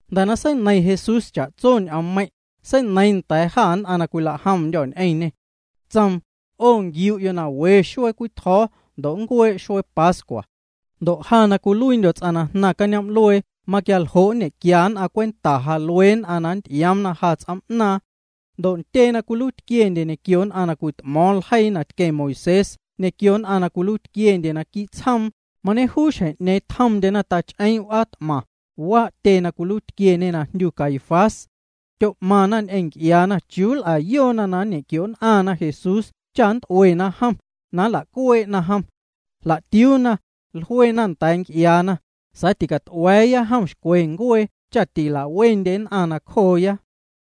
Jnda̱ na seineiⁿ Jesús cha'tso ñ'oommeiⁿ', seineiiⁿ nda̱a̱ jâ nn'aⁿ na cwilajomndyô̱ ñ'eⁿñê. Tsoom: —'O nquiu'yo' na we xuee cwii tjo̱o̱ ndo' nncuee' xuee pascua. Ndo' ja na cwiluiindyo̱ ts'aⁿ na jnaⁿ cañoom'luee maquialjo' nñe'quia nn'aⁿ cwenta ja luee nn'aⁿ na nnty'ioomna ja ts'oom'naaⁿ. Ndo' ntyee na cwiluiitquiendye ñequio nn'aⁿ na cwit'mo̱o̱ⁿ ljeii na tqueⁿ Moisés ñequio nn'aⁿ na cwiluiitquiendye naquii' tsjoom, mañejuu xjeⁿ'ñeeⁿ tjomndyena tach'eeⁿ' w'aa t'maⁿ, waa' tyee na cwiluiitquieñe na jndyu Caifás. Tyo'maⁿna ñ'eⁿ nc'iaana chiuu nl'ayoona na nñequio'nn'aⁿna Jesús cha nt'uena jom, ndo' na nla'cuee'na jom. Jla'tiuuna, jluena nda̱a̱ nc'iaana: —Sa̱a̱ ticat'ua̱a̱ya jom xcwe ncuee cha ticala'wendye nn'aⁿ nacjooya.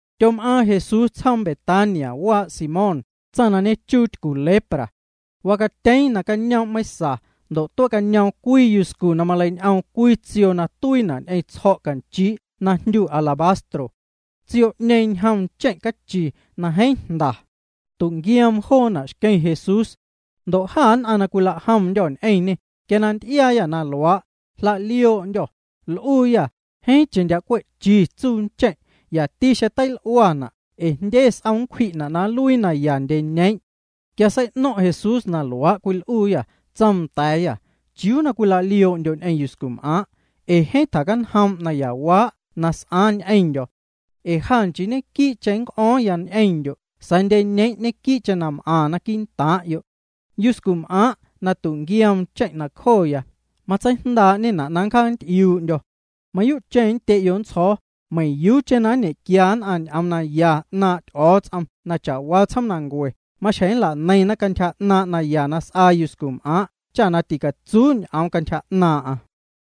Tyom'aaⁿ Jesús tsjoom Betania waa' Simón, tsaⁿ na ñechuu tycu lepra. Wacatyeeⁿ nacañoom' meiⁿsa ndo' tuee'cañoom cwii yuscu na maleiñ'oom cwii tsioo na tuiina' ñ'eⁿ tsjo̱' canchii' na jndyu alabastro. Tsioo'ñeeⁿ ñjom ncheⁿ' cachi na jeeⁿ jnda. Tu'nquioom joona' xqueⁿ Jesús. Ndo' jâ nn'aⁿ na cwilajomndyô̱ ñ'eⁿñê, quia na nty'iaayâ na luaA', jla'lioo'ndyô̱, l'uuyâ: —Jeeⁿcheⁿ ndyaa' cwe'chi tsuu ncheⁿ'. Yati xeⁿ teil'uana' ee jndye s'om nncwji'na' na nluii naya ndyeñeeⁿ'. Quia sei'no̱ⁿ' Jesús na luaa' cwil'uuyâ, tsoom nda̱a̱yâ: —¿Chiuu na cwila'lioo'ndyo' ñ'eⁿ yuscum'aaⁿ'? ee jeeⁿ tjacanjoom' nayawaa' na s'aaⁿ ñ'eⁿndyo̱. Ee ja nchii ñequii'cheⁿ nnc'o̱o̱ⁿya ñ'eⁿndyo' sa̱a̱ ndyeñeeⁿ' ñequii'cheⁿ m'aⁿna quii'ntaaⁿ'yo'. Yuscum'aaⁿ' na tu'nquioom ncheⁿ' nacjoya, matseijndaa'ñena' na nncjaacanty'iuu'ndyo̱. Mayuu'cheⁿ nndye'yo' nntsjo̱o̱, meiⁿyuucheⁿ na nñe'quia nn'aⁿ ñ'oom naya 'naaⁿ' Ty'o̱o̱ts'om na cha'waa tsjoomnancue, maxjeⁿ nla'neiⁿna cantyja 'naaⁿ' naya na s'aa yuscum'aaⁿ' cha ticatsuu ñ'oom cantyja 'naaⁿ'aⁿ.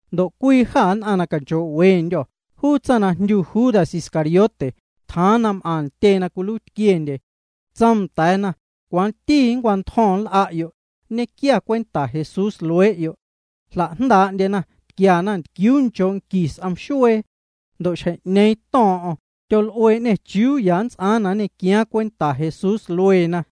Ndo' cwii jâ nn'aⁿ na canchoo'wendyô̱, juu tsaⁿ na jndyu Judas Iscariote, tjaaⁿ na m'aⁿ ntyee na cwiluiitquiendye. Tsoom nda̱a̱na: —¿Cwanti nncwantjo̱ⁿ nl'a'yo', nñequia cwenta Jesús luee'yo'? Jla'jndaa'ndyena, tquiana ntquiuu nchoo' qui s'om xuee. Ndo' xjeⁿ'ñeeⁿ to̱o̱ⁿ'o̱ⁿ, tyol'uee'ñê chiuu ya nnts'aaⁿ na nñequiaaⁿ cwenta Jesús lueena.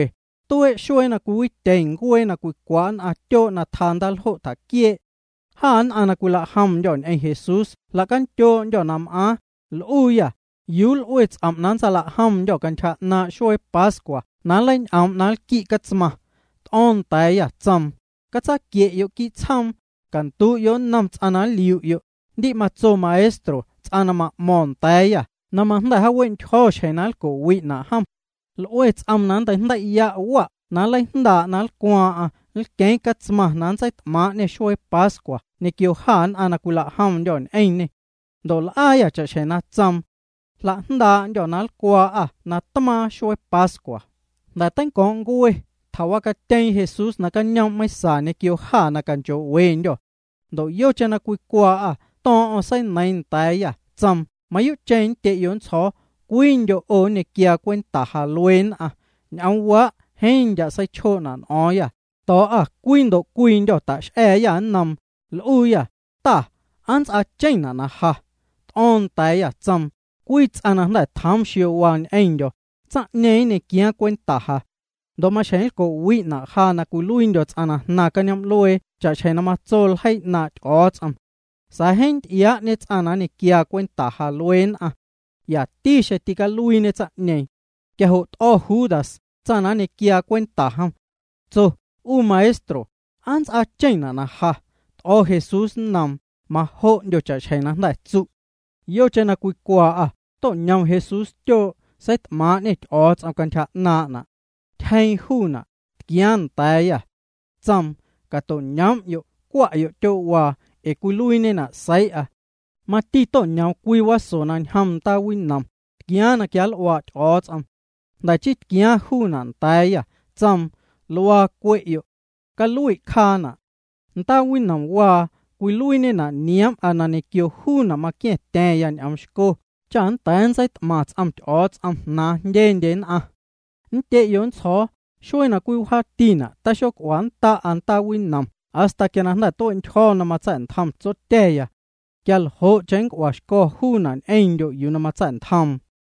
Tuee' xuee na cwiwityeⁿ ncuee na cwicwa' nn'aⁿ tyoo' na tjaa ndaaljo' tjaquiee'. Jâ nn'aⁿ na cwilajomndyô̱ ñ'eⁿ Jesús jla'candyoo'ndyô̱ na m'aaⁿ, l'uuyâ: —¿Yuu l'ue ts'om' na nntsalajndaa'ndyô̱ cantyja 'naaⁿ' xuee pascua na nleiñ'oom' na nlqui' catsmaⁿ? T'o̱o̱ⁿ nda̱a̱yâ, tsoom: —Catsaquie'yo' quii' tsjoom, candu'yo' nnom juu ts'aⁿ na nliu'yo': “Ndi' matso Maestro ts'aⁿ na ma'mo̱o̱ⁿ nda̱a̱yâ na majnda̱ jaawe'ntyjo̱ xjeⁿ na nlco'wi'na' jom. L'ue ts'oom na nnteijndei' wa' na nleijndaa' na nlcwaaⁿ'aⁿ, nlqueeⁿ catsmaⁿ na nntseit'maaⁿ'ñê xuee pascua ñequio jâ nn'aⁿ na cwilajomndyô̱ ñ'eⁿñê.” Ndo' l'aayâ cha'xjeⁿ na tsoom. Jlajndaa'ndyô̱ na nlcwaa'â natmaaⁿ xuee pascua. Jnda̱ na teinco̱o̱ⁿ' ncue, tjawacatyeeⁿ Jesús nacañoom' meiⁿsa ñequio jâ na canchoo'wendyô̱. Ndo' yocheⁿ na cwicwaa'â to̱o̱ⁿ'o̱ⁿ, seineiiⁿ nda̱a̱yâ, tsoom: —Mayuu'cheⁿ nndye'yo' nntsjo̱o̱, cwiindyo' 'o nñequiaa cwenta ja luee nn'aⁿ. Ñ'oomwaa' jeeⁿ ndyaa' seichjoo'na' n'o̱o̱ⁿyâ. To̱o̱'â cwii ndo' cwiindyô̱ ta'x'a̱a̱yâ nnoom, l'uuyâ: —Ta, ¿aa nnts'aacheⁿna' na ja? T'o̱o̱ⁿ nda̱a̱yâ, tsoom: —Cwii ts'aⁿ na jnda̱ tjoom xiowaa ñ'eⁿndyo̱, tsaⁿ'ñeeⁿ nñequiaaⁿ cwenta ja. Ndo' maxjeⁿ nlco'wi'na' ja na cwiluiindyo̱ ts'aⁿ na jnaⁿ cañoom'luee cha'xjeⁿ na matso ljeii 'naaⁿ' Ty'o̱o̱ts'om. Sa̱a̱ jeeⁿ nty'iaa'ñe juu ts'aⁿ na nñequiaa cwenta ja luee nn'aⁿ. Yati xeⁿ tîcaluiiñe tsaⁿ'ñeeⁿ. Quia jo' t'o̱ Judas, tsaⁿ na nñequiaa cwenta jom. Tso: —'U Maestro, ¿aa nnts'aacheⁿna' na ja? T'o̱ Jesús nnoom: —Majo'ndyo cha'xjeⁿ jnda̱ tsu'. Yocheⁿ na cwicwaa'â to'ñom Jesús tyoo', seit'maaⁿ'ñê Ty'o̱o̱ts'om cantyja 'naaⁿ'na'. Tyjeeⁿ juuna', tquiaaⁿ nda̱a̱yâ. Tsoom: —Cato'ñoom'yo' cwa'yo' tyoo'waa, ee cwiluiiñena' seii'a. Mati to'ñoom cwii waso na ñjom ndaa winom, tquiaaⁿ na quianl'uaa' Ty'o̱o̱ts'om. Jnda̱ chii tquiaaⁿ juuna' nda̱a̱yâ, tsoom: —Luaa cwe'yo'. Calui' cjaana'. Ndaa winomwaa cwiluiiñena' nioom'a na ñequio juuna' maqua̱ⁿtya̱ⁿya ñ'oom xco cha nnda̱a̱ ntseit'maⁿ ts'om Ty'o̱o̱ts'om jnaaⁿ jndyendye nn'aⁿ. Nndye'yo' nntsjo̱o̱, xuee na cwii wjaatina' taxoc'uannda'a ndaa winom hasta quia jnda̱ tue'ntyjo̱ na mamatsa̱'ntjom Tsotya̱. Quia ljo'cheⁿ nnc'uaxco̱ juuna' ñ'eⁿndyo' yuu na matsa̱'ntjoom.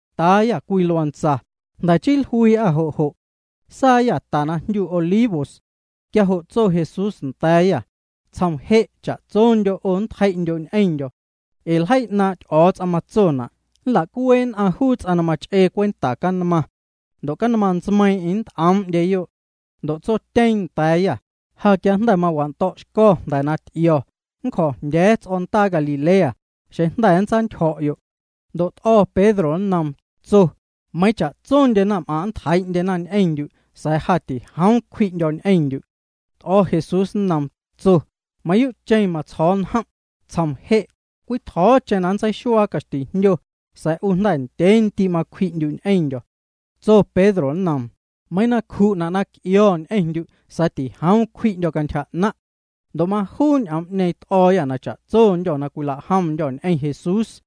Taayâ cwii luantsa, jnda̱ chii jluii'â jo' jo'. Saayâ ta na jndyu Olivos. Quia jo' tso Jesús nda̱a̱yâ: —Tsjom je' cha'tsondyo' 'o nntjei'ndyo' ñ'eⁿndyo̱. Ee ljeii 'naaⁿ' Ty'o̱o̱ts'om matsona': “Nla'cuee' nn'aⁿ juu ts'aⁿ na mach'ee cwenta canmaⁿ. Ndo' canmaⁿ ntsmeiiⁿ'eⁿ nnt'oom'ndyeyo'.” Ndo' tsotyeeⁿ nda̱a̱yâ: —Ja quia na jnda̱ mawando̱'xco̱ na jnda̱ ty'io̱, nncjo̱jndya̱a̱ ts'o̱ndaa Galilea, xeⁿ jnda̱ nntsantyjo̱'yo'. Ndo' t'o̱ Pedro nnoom, tso: —Meiiⁿ cha'tsondye naⁿm'aⁿ' nntjeii'ndyena ñ'eⁿndyu' sa̱a̱ ja tijoom cwji'ndyo̱ ñ'eⁿndyu'. T'o̱ Jesús nnoom, tso: —Mayuu'cheⁿ matsjo̱o̱ njom', tsjom je', cwii tjo̱o̱cheⁿ na nntseixuaa caxtijndyo, sa̱a̱ 'u jnda̱ ndyee ndii' macwji'ndyu' ñ'eⁿndyo̱. Tso Pedro nnoom: —Meiiⁿ na nncju'na' na c'io̱ ñ'eⁿndyu' sa̱a̱ tijoom cwji'ndyo̱ cantyja 'naⁿ'. Ndo' majuu ñ'oom t'o̱o̱yâ na cha'tsondyô̱ na cwilajomndyô̱ ñ'eⁿ Jesús.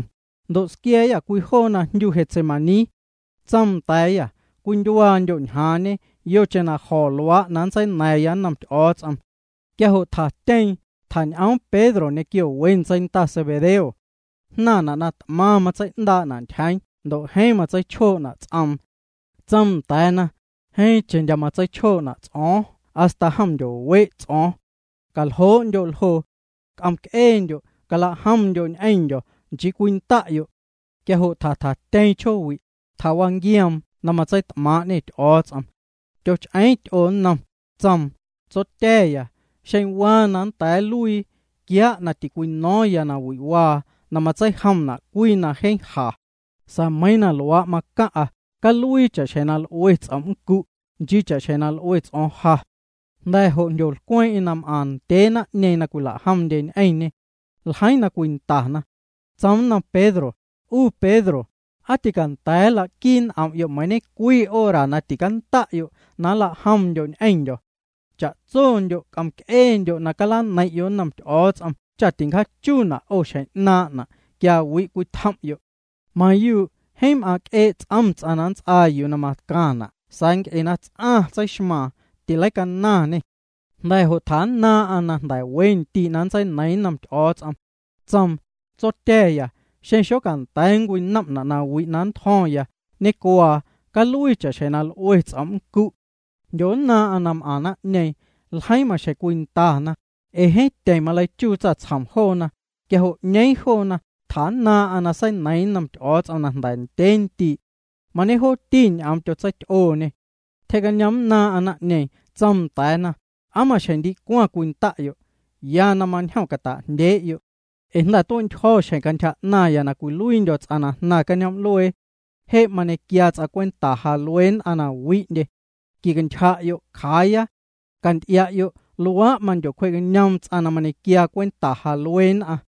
Ndo' squia̱a̱yâ cwii joo na jndyuna' Getsemaní. Tsoom nda̱a̱yâ: —Cwindyuaandyo' ñjaaⁿñe yocheⁿ na jo̱ luaa' na nntseina̱ⁿya nnom Ty'o̱o̱ts'om. Quia jo' tjatyeeⁿ, tjañ'oom Pedro ñequio we ntseinda Zebedeo. Jnaⁿna' na t'maⁿ matsei'ndaa'na' ntyjeeⁿ, ndo' jeeⁿ matseichjoo'na' ts'oom. Tsoom nda̱a̱na: —Jeeⁿcheⁿ ndyaa' matseichjoo'na' ts'o̱o̱ⁿ hasta jom ndyowe' ts'o̱o̱ⁿ. Caljoo'ndyo' ljoo. C'om'c'eendyo', calajomndyo' ñ'eⁿndyo̱, nchii cwinda'yo'. Quia jo' tjatjatyeeⁿ chjoowi'. Tjawanquioom na matseit'maaⁿ'ñê Ty'o̱o̱ts'om. Tyoch'eeⁿ ty'oo nnom, tsoom: —Tsotya̱ya, xeⁿ aa waa na nnda̱a̱ nluii, quiaa' na tincwino̱o̱ⁿya nawi'waa na matseijomna' cwii na jeeⁿ ja. Sa̱a̱ meiiⁿ na luaa' macaⁿ'a, caluii cha'xjeⁿ na l'ue ts'om' nncu', nchii cha'xjeⁿ na l'ue ts'o̱o̱ⁿ ja. Jnda̱ jo' jndyolcweeⁿ'eⁿ na m'aⁿ ndyee naⁿ'ñeeⁿ na cwila'jomndye ñ'eⁿñê. Ljeiiⁿ na cwindana. Tsoom nnom Pedro: —'U Pedro, ¿aa tîcanda̱a̱ nlaquii n'om'yo' meiiⁿ ñe'cwii hora na ticanda'yo' na nlajomndyo' ñ'eⁿndyo̱? Cha'tsondyo' c'om'c'eendyo' na calaneiⁿ'yo' nnom Ty'o̱o̱ts'om cha ticjaachuuna' 'o xjeⁿ 'naaⁿ'na' quia wi' cwitjom'yo'. Mayuu', jeeⁿ m'aaⁿc'ee' ts'om ts'aⁿ na nnts'aa yuu na macaⁿna' sa̱a̱ nc'e na ts'aⁿ tseixmaaⁿ, tileicanaⁿñê. Jnda̱ jo' tjannaaⁿ'aⁿ na jnda̱ we ndii' na nntseineiiⁿ nnom Ty'o̱o̱ts'om. Tsoom: —Tsotya̱ya, xeⁿ xocanda̱a̱ na nncwinom'na' nawi' na nntjo̱ⁿya, ñecuaa, caluii cha'xjeⁿ na l'ue ts'om' nncu'. Jndyonnaaⁿ'aⁿ na m'aⁿ naⁿ'ñeeⁿ. Ljeiiⁿ maxjeⁿ cwindana, ee jeeⁿ tyeⁿ maleichuu tsaⁿtsjom joona. Quia jo' 'ñeeⁿ joona, tjannaaⁿ'aⁿ na seineiiⁿ nnom Ty'o̱o̱ts'om na jnda̱ ndyee ndii'. Mañejooti ñ'oom tyotseity'ooñê. Tyjee'cañoomnnaaⁿ'aⁿ naⁿ'ñeeⁿ, tsoom nda̱a̱na: —¿Aa maxjeⁿ ndicwaⁿ cwinda'yo'? Ya na mañjom cwita'jndyee'yo'. Cwa je' c'om'c'eendyo', ee jnda̱ tue'ntyjo̱ xjeⁿ cantyja 'naⁿya na cwiluiindyo̱ ts'aⁿ na jnaⁿ cañoom'luee. Je' mañequiaa ts'aⁿ cwenta ja luee nn'aⁿ na wi'ndye. Quicantyja'yo', cjaaya. Canty'ia'yo' luaa' mandyocwjee'cañoom juu ts'aⁿ na mañequiaa cwenta ja luee nn'aⁿ.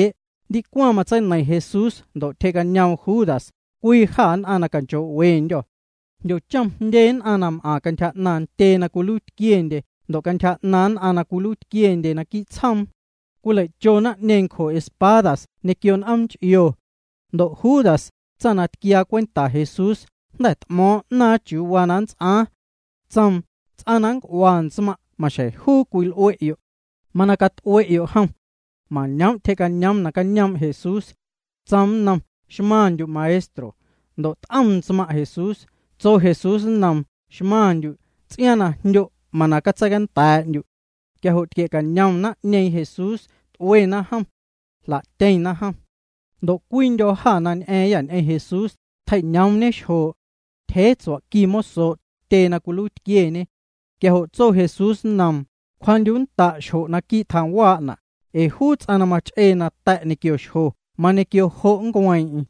Ndicwaⁿ matseineiⁿ Jesús ndo' tyjee'cañoom Judas, cwii jâ nn'aⁿ na canchoo'wendyô̱. Jndyochom jndye nn'aⁿ na m'aⁿ cantyja 'naaⁿ ntyee na cwiluiitquiendye ndo' cantyja 'naaⁿ nn'aⁿ na cwiluiitquiendye naquii' tsjoom. Cwilei'cho naⁿ'ñeeⁿ ncjo espadas ñequio n'oom nch'io. Ndo' Judas, tsaⁿ na tquiaa cwenta Jesús, jnda̱ t'mo̱o̱ⁿ 'naaⁿ chiuu waa na nnts'aaⁿ. Tsoom: —Ts'aⁿ na nnc'ua ntsmaⁿ' maxjeⁿ juu na cwil'ue'yo'. Mana cat'ue'yo' jom. Mañoom' tyjee'cañoom nacañoom' Jesús. Tsoom nnom: —Xmaⁿndyu' Maestro. Ndo' t'om ntsmaⁿ' Jesús. Tso Jesús nnoom: —Xmaⁿndyu'. Ts'iaaⁿ na jndyo', mana catseicanda̱a̱'ndyu'. Quia jo' tquie'cañom naⁿ'ñeeⁿ Jesús, t'uena jom. Jla'tyeⁿna jom. Ndo' cwiindyô̱ jâ na ñ'a̱a̱ⁿyâ ñ'eⁿ Jesús, tjei'ñoomñe xjoo'. Tyjee tsua'qui mosoo' tyee na cwiluiitquieñe. Quia jo' tso Jesús nnoom: —Cwjaa'ndyu'nnda' xjo' naquii' tjaⁿwaa'na'. Ee juu ts'aⁿ na mach'ee nata̱' quio xjo mañequio jo' nncueeⁿ'eⁿ.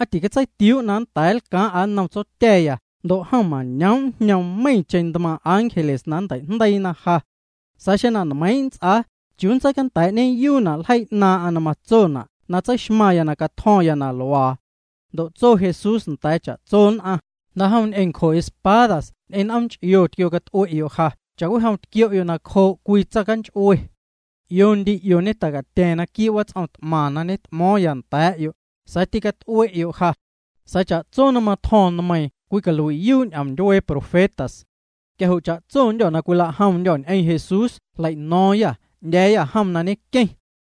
¿Aa ticatseitiuu' na nnda̱a̱ nlcaaⁿ'a nnom Tsotya̱ ndo' jom mañoom' njñoom meiⁿcheⁿ ntmaaⁿ' ángeles na nntei'jndeiina ja? Sa̱a̱ xeⁿ na nmeiⁿ' nnts'aa, ¿chiuu nntseicanda̱a̱'ñeyuuna' ljeii 'naaⁿ'aⁿ na matsona' na tseixmaⁿya na catjo̱ⁿya na luaa? Ndo' tso Jesús nda̱a̱ cha'tso nn'aⁿ: —Jnda'jom ñ'eⁿ ncjo espadas ñ'eⁿ n'oom nch'io tquiocat'ue'yo' ja cha'cwijom tquio'yo' nacjoo' cwii tsaⁿcanch'ue. 'Io ndii 'io ñeta'catya̱ⁿ naquii' wats'om t'maⁿ na ñet'mo̱o̱ⁿ nda̱a̱'yo', sa̱a̱ tîcat'ue'yo' ja. Sa̱a̱ cha'tso na matjo̱ⁿ nmeiiⁿ cwicalui'yuu' ñ'oom ndyuee profetas. Quia jo' cha'tsondyô̱ na cwilajomndyô̱ ñ'eⁿ Jesús jlei'no̱o̱ⁿyâ, 'ndya̱a̱yâ jom na ñenqueⁿ.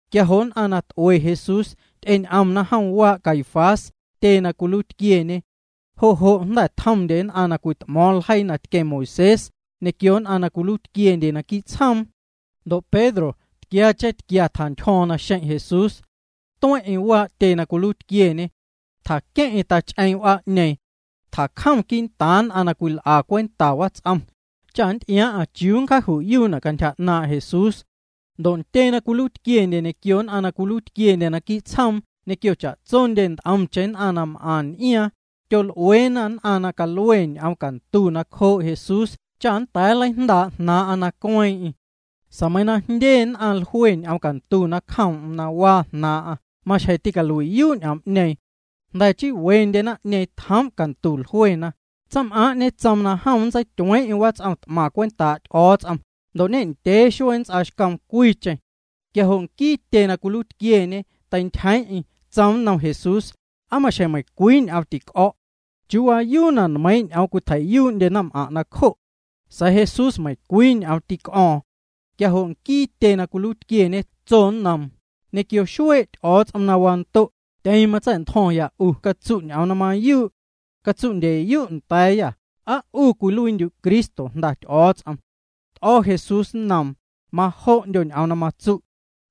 Quia jo' nquiee nn'aⁿ na t'ue Jesús, ty'eñ'omna jom waa' Caifás, juu tyee na cwiluiitquieñe. Jo' jo' jnda̱ tjomndye nn'aⁿ na cwit'mo̱o̱ⁿ ljeii na tqueⁿ Moisés, ñequio nn'aⁿ na cwiluiitquiendye naquii' tsjoom. Ndo' Pedro tquiacheⁿ tquia tjantyjo̱o̱ⁿ naxeⁿ' Jesús. Tueⁿ'eⁿ waa' tyee na cwiluiitquieñe. Tjaqueⁿ'eⁿ tach'eeⁿ' w'aa'ñeeⁿ. Tjacjom quii'ntaaⁿ nn'aⁿ na cwil'a cwenta wats'om, cha nnty'iaaⁿ'aⁿ chiuu nncjaaju'yuuna' cantyja 'naaⁿ' Jesús. Ndo' ntyee na cwiluiitquiendye ñequio nn'aⁿ na cwiluiitquiendye naquii' tsjoom ñequio cha'tsondye nt'omcheⁿ nn'aⁿ na m'aⁿ n'iaaⁿ, tyol'ueena nn'aⁿ na calue ñ'oom cantu nacjoo' Jesús cha nnda̱a̱ nleijndaa' jnaaⁿ'aⁿ na cueeⁿ'eⁿ. Sa̱a̱ meiiⁿ na jndye nn'aⁿ jlue ñ'oom cantu nacjoom'm na waa jnaaⁿ'aⁿ maxjeⁿ ticalui'yuu' ñ'oom'ñeeⁿ. Jnda̱ chii wendye naⁿ'ñeeⁿ tjoom' cantu jluena: —Tsaⁿm'aaⁿ' ñetsoom jom nntseityueeⁿ'eⁿ wats'om t'maⁿ cwentaa' Ty'o̱o̱ts'om, ndo' ñendyee xuee na nnts'aaxcoom cwiicheⁿ. Quia jo' nquii tyee na cwiluiitquieñe teintyjeeⁿ'eⁿ, tsoom nnom Jesús: —¿Aa maxjeⁿ meiⁿcwii ñ'oom tic'o̱'? ¿Chiuu waayuu na nmeiiⁿ' ñ'oom cwitjei'yuu'ndye naⁿm'aⁿ' nacjo'? Sa̱a̱ Jesús meiⁿcwii ñ'oom tic'o̱o̱ⁿ. Quia jo' nquii tyee na cwiluiitquieñe tso nnoom: —Ñequio xuee' Ty'o̱o̱ts'om na wando', tyeⁿ matsa̱'ntjo̱ⁿya 'u, catsu' ñ'oom na mayuu'. Catsu'ndyeyu' nndya̱a̱yâ, ¿aa 'u cwiluiindyu' Cristo, Jnda Ty'o̱o̱ts'om? T'o̱ Jesús nnoom: —Majo'ndyo ñ'oom na matsu'.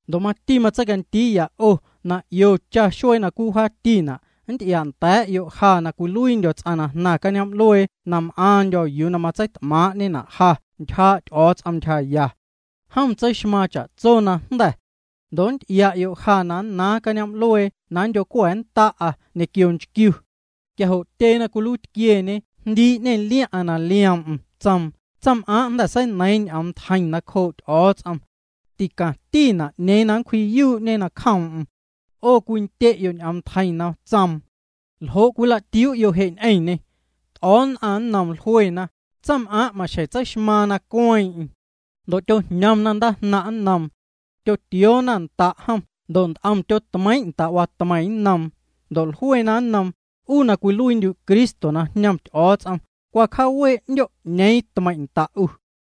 Ndo' mati matseicandiiya 'o na 'io cha xuee na cwii wjaatina' nnty'ia'nda̱a̱'yo' ja na cwiluiindyo̱ ts'aⁿ na jnaⁿ cañoom'luee na m'aaⁿndyo̱ yuu na matseit'maaⁿ'ñena' ja ntyjaa' Ty'o̱o̱ts'om ntyjaya. Jom tseixmaaⁿ cha'tso najnda̱. Ndo' nnty'ia'yo' ja na nnaaⁿ cañoom'luee na nndyo̱cua̱nnda'a ñequio nchquiu. Quia jo' tyee na cwiluiitquieñe jndii'ñê liaⁿ'aⁿ na lioom'm, tsoom: —Tsaⁿm'aaⁿ jnda̱ seineiiⁿ ñ'omntjeiⁿ nacjoo' Ty'o̱o̱ts'om. Ticaⁿtina' 'ñeeⁿ na nncwji'yuu'ñe nacjoom'm. 'O cwindye'yo' ñ'omntjeiⁿ na tsoom. ¿Ljo' cwilatiuu'yo' je' ñ'eⁿñê? T'o̱o̱ nn'aⁿ nnoom, jluena: —Tsaⁿm'aaⁿ' maxjeⁿ tseixmaaⁿ na cueeⁿ'eⁿ. Ndo' tyojñomna ndaajnaⁿ' nnoom. Tyotioona nda' jom ndo' nt'om tyotmeiiⁿ' nda' watmeiⁿ nnoom. Ndo' jluena nnoom: —'U na cwiluiindyu' Cristo na jñom Ty'o̱o̱ts'om, cwa cjaawee' 'ndyo' 'ñeeⁿ tmeiⁿ' nda' 'u.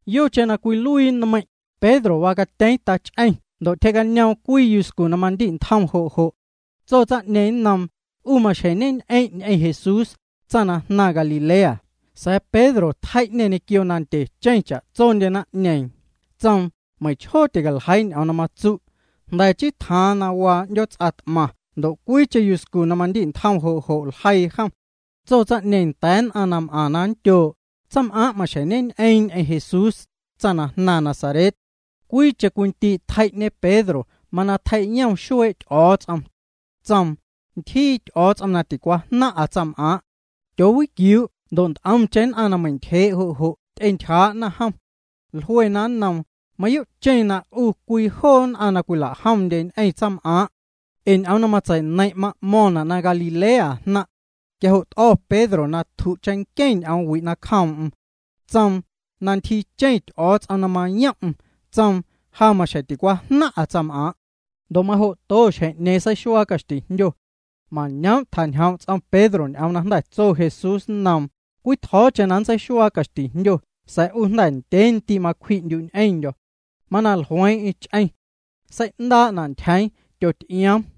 Yocheⁿ na cwiluii na nmeiiⁿ', Pedro wacatyeeⁿ tach'eⁿ ndo' tyjee'cañoom cwii yuscu na mandi'ntjom jo' jo'. Tso tsaⁿ'ñeeⁿ nnoom: —'U maxjeⁿ ñeñ'eⁿ' ñ'eⁿ Jesús, tsaⁿ na jnaⁿ Galilea. Sa̱a̱ Pedro tjei'ñê ñequio na ndye cha'tsondye naⁿ'ñeeⁿ. Tsoom: —Meiⁿchjoo ticaljeii ñ'oom na matsu'. Jnda̱ chii tjaaⁿ na waa 'ndyoots'a t'maⁿ ndo' cwiicheⁿ yuscu na mandi'ntjom jo' jo' ljeii jom. Tso tsaⁿ'ñeeⁿ nda̱a̱ nn'aⁿ na m'aⁿ na nndyoo': —Tsaⁿm'aaⁿ maxjeⁿ ñeñ'eeⁿ ñ'eⁿ Jesús, tsaⁿ na jnaⁿ Nazaret. Cwiicheⁿ cwii ndii' tjei'ñe Pedro mana tjei'yom xuee' Ty'o̱o̱ts'om. Tsoom: —Ntyjii Ty'o̱o̱ts'om na ticwajnaⁿ'a tsaⁿm'aaⁿ'. Tyoowiquiuu' ndo' nt'omcheⁿ nn'aⁿ na meintyjee' jo' jo' ty'entyjaa'na jom. Jluena nnoom: —Mayuu'cheⁿ na 'u cwii joo nn'aⁿ na cwila'jomndye ñ'eⁿ tsaⁿm'aaⁿ'. Ee ñ'oom na matsei'neiⁿ' ma'mo̱ⁿna' na Galilea jnaⁿ'. Quia jo' to̱' Pedro na tju' cheⁿnqueⁿ ñ'omwi' nacjoom'm. Tsoom na ntyjiicheⁿ Ty'o̱o̱ts'om na mayom'm. Tsoom: —Ja maxjeⁿ ticwajnaⁿ'a tsaⁿm'aaⁿ'. Ndo' majo'to xjeⁿ'ñeeⁿ seixuaa caxtijndyo. Mañoom' tjañjoom' ts'om Pedro juu ñ'oom na jnda̱ tso Jesús nnoom: “Cwii tjo̱o̱cheⁿ na nntseixuaa caxtijndyo sa̱a̱ 'u jnda̱ ndyee ndii' macwji'ndyu' ñ'eⁿndyo̱.” Mana jlueeⁿ'eⁿ ch'eⁿ. Sei'ndaa'ñ'eⁿna' ntyjeeⁿ, tyoty'ioom.